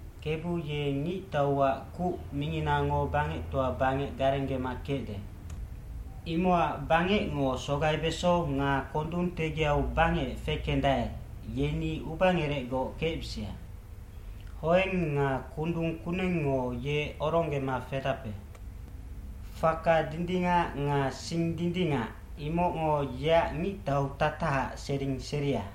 Kebu ye ngictauac kuc minginango bangectoa bangec garenggema kecde. Imocac bangecngo sogaibeso nga kondung tegiau bangec fekendae, yeni ubangerecgoc kecbisia. Hoeng nga kundung kunengngo ye oronggema fedape. Faka dindingac nga sing dindingac, imocngo yeac ngictautatahaac sering seria.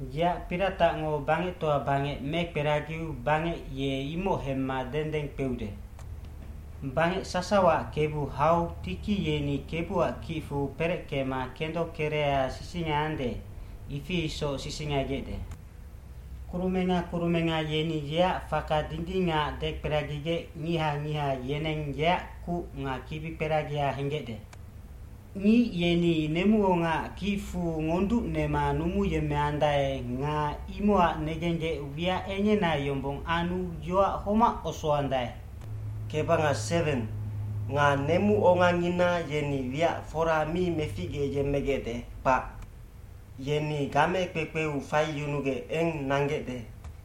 Yeac piratacngo bangectoa bangec mekperagiu bangec ye imoc hemma dendeng kpeude. Bangec sasawaac Kebu hau tiki yeni Kebuac kicfu pereckema kendo kereha sisingaiande, ifi isoc sisingaigecde. Kurumenga kurumenga yeni yeac faka dindingac dekperagigec ngiha ngiha yeneng yeac kuc nga kibikperagia henggecde. Ngic yeni nemuongaac kicfu ngonducnema numuyemmeandae nga imocac negenggec wiac engena yombong anu yoac homac osoandae. Nga nemuongangina yeni wiac fora mi meficgeyemmegecde, kpac. Yeni game kpekpeu faiyunugec eng nanggecde.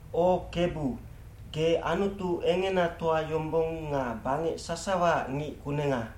O Kebu, ge Anutu engenatoa yombong nga bangec sasawaac ngic kunenga.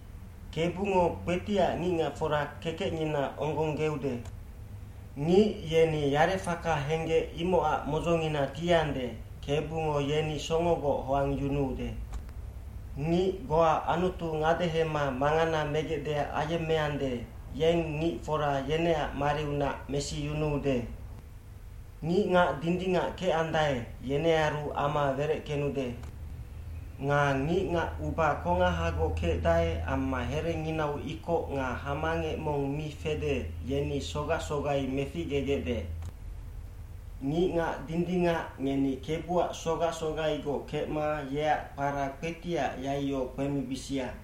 Kebungo kpetiac ngicngacfora kekecngina onggonggeude. Ngic yeni yarefaka henggec imocac modzongina tiande, Kebungo yeni songogoc hoangyunuude. Ngic goa Anutu ngadehema mangana megecdeac ayemmeande, yeng ngicfora yeneac mariunac mesiyunuude. Ngicngac dindingac kecandae, yenearu ama wereckenude. Nga ngicngac uba kongahagoc kecdae amma herenginau ikoc nga hamangec mong mi fede, yeni sogac sogai meficgegecde. Ngicngac dindingac ngeni Kebuac sogac sogaigoc kecma yeac kpara kpetiac yaiyo kpemibisia.